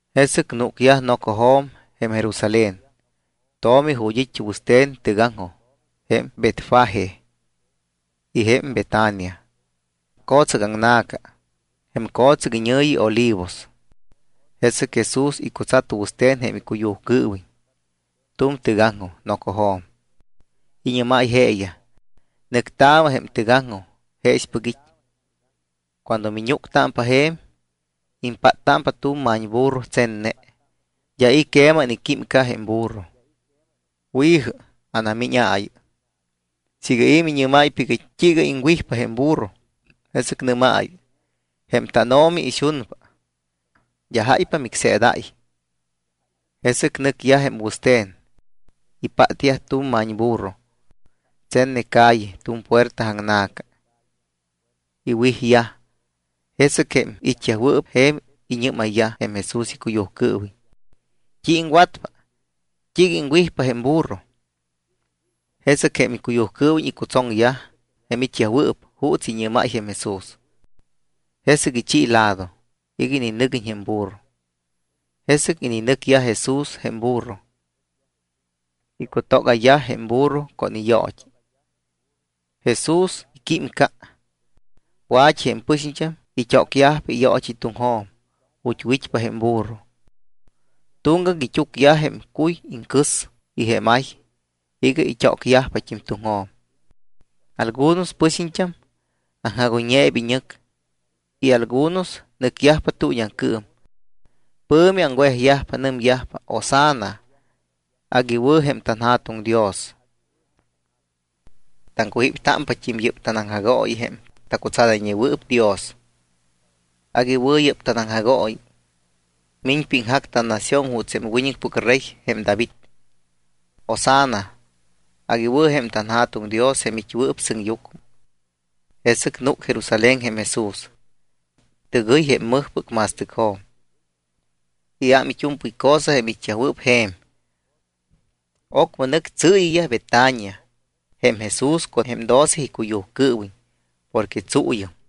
Jesɨc núcyajpa nocojo̱m jém Jerusalén tomi ju̱t́ it́ jém wɨste̱n tɨgaŋjoj jém Betfagé y jém Betania, co̱tsɨc aŋna̱ca, jém co̱tsɨc iñɨ̱yi Olivos. Jesɨc Jesús icutsat wɨste̱n jém icuyujcɨɨwiñ tu̱m tɨgaŋjoj nocojo̱m. Iñɨ́máy jeeyaj: —Nɨctaamɨ jém tɨgaŋjoj jeexpɨc it́. Cuando miñúctámpa je̱m, impáttámpa tu̱m ma̱ñburro tsenne. D́a i̱ queman iquímca jém burro. Wi̱jɨ, anamíñaayɨ. Siiga i̱ miñɨ́máypa iga t́iiga iŋwijpa jém burro, jesɨc nɨ́maayɨ: “Jém tánO̱mi ixunpa. D́a jáypa micseedáy.” Jesɨc nɨcyaj jém wɨste̱n. Ipátyaj tu̱m ma̱ñburro tsenne calle tu̱m puerta aŋna̱ca. Iwijyaj. Jesɨc jém it́yajwɨɨp je̱m iñɨ́mayyaj jém Jesús icuyujcɨɨwiñ: —¿T́i iŋwatpa? ¿T́iiga iŋwijpa jém burro? Jesɨc jém icuyujcɨɨwiñ icutsoŋyaj jém it́yajwɨɨp juuts iñɨ́máy jém Jesús. Jesɨc ichi lado iga ininɨguiñ jém burro. Jesɨc ininɨgayyaj Jesús jém burro, icutógayyaj jém burro con iyoot́i. Jesús iquímca. Wa̱t́i jém pɨxiñt́am it́ócyaj iyoot́i tuŋjo̱m ju̱t́ wit́pa jém burro. Tuŋgac it́úcyaj jém cuy iŋcɨs y jém ay iga it́ócyajpat́im tuŋjo̱m. Algunos jém pɨxiñt́am aŋjagoyñeyaj iñɨc y algunos nɨcyajpa tuuñiaŋcɨɨm. Pɨ̱mi aŋwejyajpa. Nɨmyajpa: —¡Hosanna! Agui wɨ̱ jém tanJa̱tuŋ Dios. Taŋcujíptámpat́im yɨ́p tanaŋjagooyi jém tacutsadayñewɨɨp Dios. Agui wɨ̱ yɨ́p tanaŋjagooyi. Miñpa iŋjac tannación juuts jém wiñɨcpɨc rey jém David. ¡Hosanna! Agui wɨ̱ jém tanJa̱tuŋ Dios jém it́wɨɨp sɨŋyucmɨ. Jesɨc núc Jerusalén jém Jesús. Tɨgɨy jém mɨjpɨc ma̱stɨcjo̱m, iám it́u̱mpɨy cosa jém it́yajwɨɨp je̱m. Ocmɨ nɨc tsɨɨyiyaj Betania jém Jesús con jém doce icuyujcɨɨwiñ porque tsuuyɨm.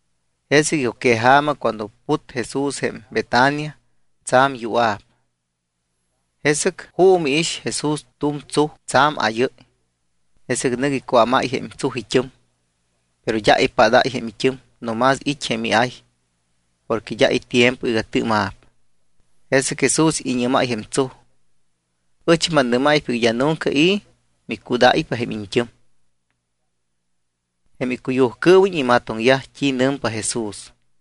Jesɨc icuqueja̱ma cuando put Jesús jém Betania, tsa̱m yua̱p. Jesɨc juumɨ iix Jesús tu̱m tsuj tsa̱m áyɨ́y. Jesɨc nɨc icuámáy jém tsuj it́ɨm. Pero d́a ipadáy jém it́ɨm no más it́ jém iay porque d́a itiempo iga tɨɨma̱p. Jesɨc Jesús iñɨ́máy jém tsuj: —Ɨch mannɨ́máypa iga d́a nunca i̱ micudáypa jém iñt́ɨm. Jém icuyujcɨɨwiñ imatoŋyaj t́i nɨmpa Jesús.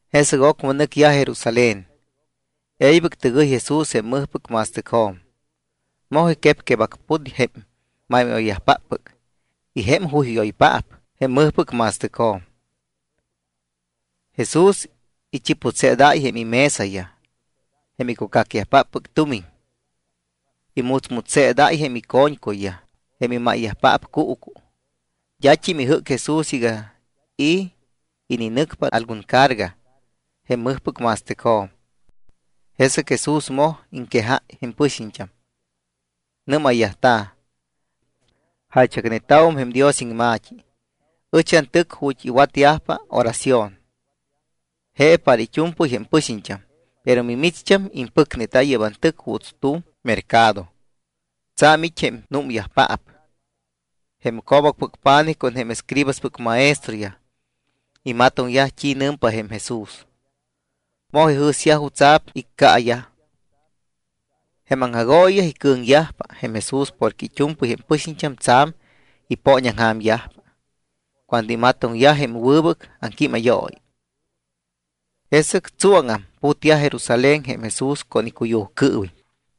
Jesɨc ocmɨ nɨcyaj Jerusalén. E̱ybɨc tɨgɨy Jesús jém mɨjpɨc ma̱stɨcjo̱m. Moj iquepquebacput jém máymáyoyyajpaap y jém juyjúyoyyajpaap jém mɨjpɨc ma̱stɨcjo̱m. Jesús ichiputseedáy jém imesayaj jém icucacyajpaap tumiñ. Imutsmutsseedáy jém ico̱ñcuyyaj jém imáyyajpaap cuucu. D́at́im ijɨ́cpa Jesús iga i̱ ininɨcpa algun carga jém mɨjpɨc ma̱stɨcjo̱m. Jesɨc Jesús moj iŋquejáy jém pɨxiñt́am. Nɨ́mayyajta̱: —Jaychacneta̱wum jém Dios iŋma̱t́i: “Ɨch antɨc ju̱t́ iwatyajpa oración. Je para it́u̱mpɨy jém pɨxiñt́am.” Pero micht́am impɨcneta yɨ́p antɨc juuts tu̱m mercado, tsa̱m it́ jém númyajpaap. Jém co̱bacpɨc pa̱nijyaj con jém escribaspɨc maestroyaj imatoŋyaj t́i nɨmpa jém Jesús. Moj ijɨ̱syaj jutsa̱p iccaayaj. Jém aŋjagooyiyaj icɨ̱ŋyajpa jém Jesús porque it́u̱mpɨy jém pɨxiñt́am tsa̱m ipooñaŋja̱myajpa cuando imatoŋyaj jém wɨbɨc iŋquímayooyi. Jesɨc tsuáŋam putyaj Jerusalén jém Jesús con icuyujcɨɨwiñ.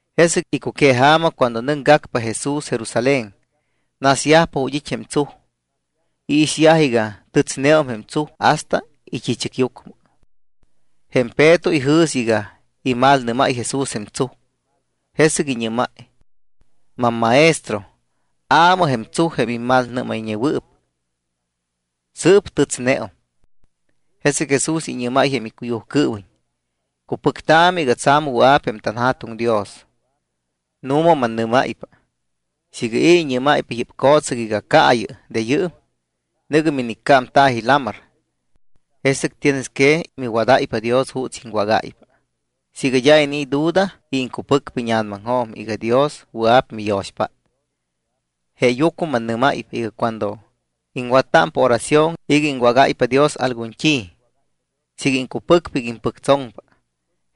Jesɨc icuqueja̱ma cuando nɨcgacpa Jesús Jerusalén, nasyajpa ju̱t́ it́ jém tsuj. Iixyaj iga tɨtsneum jém tsuj hasta it́i̱chɨcyucmɨ. Jém Peto ijɨ̱s iga imalnɨ́máy Jesús jém tsuj, jesɨc iñɨ́máy: —MamMaestro, aamɨ jém tsuj jém immalnɨ́mayñewɨɨp. Sɨɨp tɨtsneum. Jesɨc Jesús iñɨ́máy jém icuyujcɨɨwiñ: —Cupɨctaamɨ iga tsa̱m wɨa̱p jém tanJa̱tuŋ Dios. Nu̱ma mannɨ́máypa, siiga i̱ iñɨ́máypa yɨ́p co̱tsɨc iga: “Caayɨ de yɨɨm, nɨ̱gɨ miniccámta̱ji lamar”, jesɨc tienes que miwadáypa Dios juuts iŋwágáypa siiga d́a inii̱ duda y iŋcupɨcpa íña̱namaŋjo̱m iga Dios wɨa̱p miyo̱xpát. Jeeyucmɨ mannɨ́máypa iga cuando iŋwattámpa oración iga iŋwágáypa Dios algun t́i, siiga iŋcupɨcpa iga impɨctsoŋpa,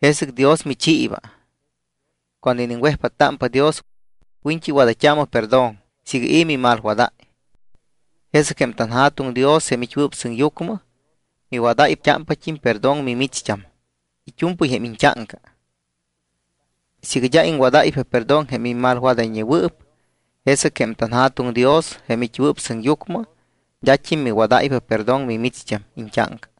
jesɨc Dios michiiba. Cuando iniŋwejpáttámpa Dios, wiñt́i wadayt́aamɨ perdón siiga i̱ mimalwadáy. Jesɨc jém tanJa̱tuŋ Dios, jém it́wɨɨp sɨŋyucmɨ, miwadayt́ámpat́im perdón mimicht́am it́u̱mpɨy jém iñt́áŋca. Siiga d́a iŋwadáypa perdón jém mimalwadayñewɨɨp, jesɨc jém tanJa̱tuŋ Dios jém it́wɨɨp sɨŋyucmɨ d́at́im miwadáypa perdón mimicht́am iñt́áŋca.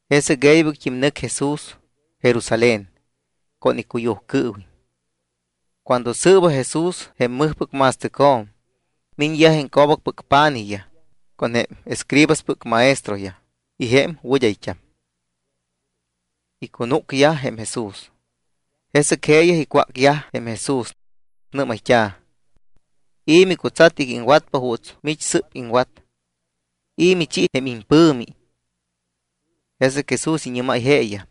Jesɨc e̱ybɨct́im nɨc Jesús Jerusalén con icuyujcɨɨwiñ. Cuando sɨɨba Jesús jém mɨjpɨc ma̱stɨcjo̱m, miñyaj jém co̱bacpɨc pa̱nijyaj con jém escribaspɨc maestroyaj y jém wɨd́ayt́am. Icunúcyaj jém Jesús. Jesɨc jeeyaj icwácyaj jém Jesús. Nɨ́mayt́a̱: —¿I̱ micutsat iga iŋwatpa juuts mich sɨ́p iŋwat? ¿I̱ michi jém impɨ̱mi? Jesɨc Jesús iñɨ́máy jeeyaj: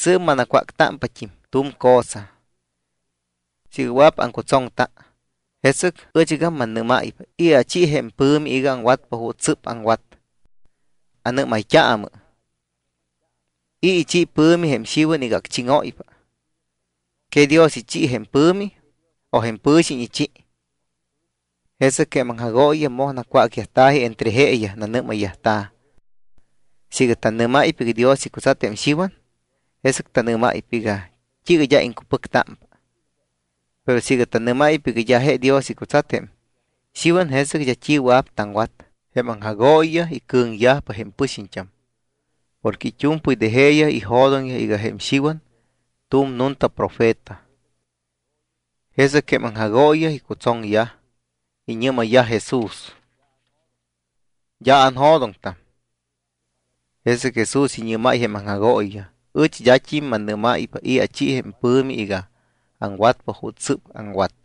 —Sɨɨp manacwácpat́im tu̱m cosa. Siiga wɨa̱p aŋcutsoŋta, jesɨc ɨchgam mannɨ́máypa i̱ achi jém pɨ̱mi iga aŋwatpa juuts sɨ́p aŋwat. Anɨ́mayt́aamɨ, ¿i̱ ichi ipɨ̱mi jém Xiwan iga acchíŋóypa? ¿Que Dios ichi jém ipɨ̱mi o pɨ̱xiñ ichi? Jesɨc jém aŋjagooyiyaj moj nacwácyajta̱ji entre jeeyaj. Nanɨ́mayyajta̱: —Siiga tannɨ́máypa iga Dios icutsat jém Xiwan, jesɨc tanɨ́máypa iga: “¿T́iiga d́a iŋcupɨctámpa?” Pero siiga tannɨ́máypa iga d́a je Dios icutsat jém Xiwan, jesɨc d́a t́i wɨa̱p taŋwat. Jém aŋjagooyiyaj icɨ̱ŋyajpa jém pɨxiñt́am porque it́u̱mpɨy de jeeyaj ijo̱doŋyaj iga jém Xiwan tu̱m nunta profeta. Jesɨc jém aŋjagooyiyaj icutsoŋyaj. Iñɨ́mayyaj Jesús: —D́a anjo̱doŋtam. Jesɨc Jesús iñɨ́máyt́im jém aŋjagooyiyaj: —Ɨch d́at́im mannɨ́máypa i̱ achi jém pɨ̱mi iga aŋwatpa juuts sɨ́p aŋwat.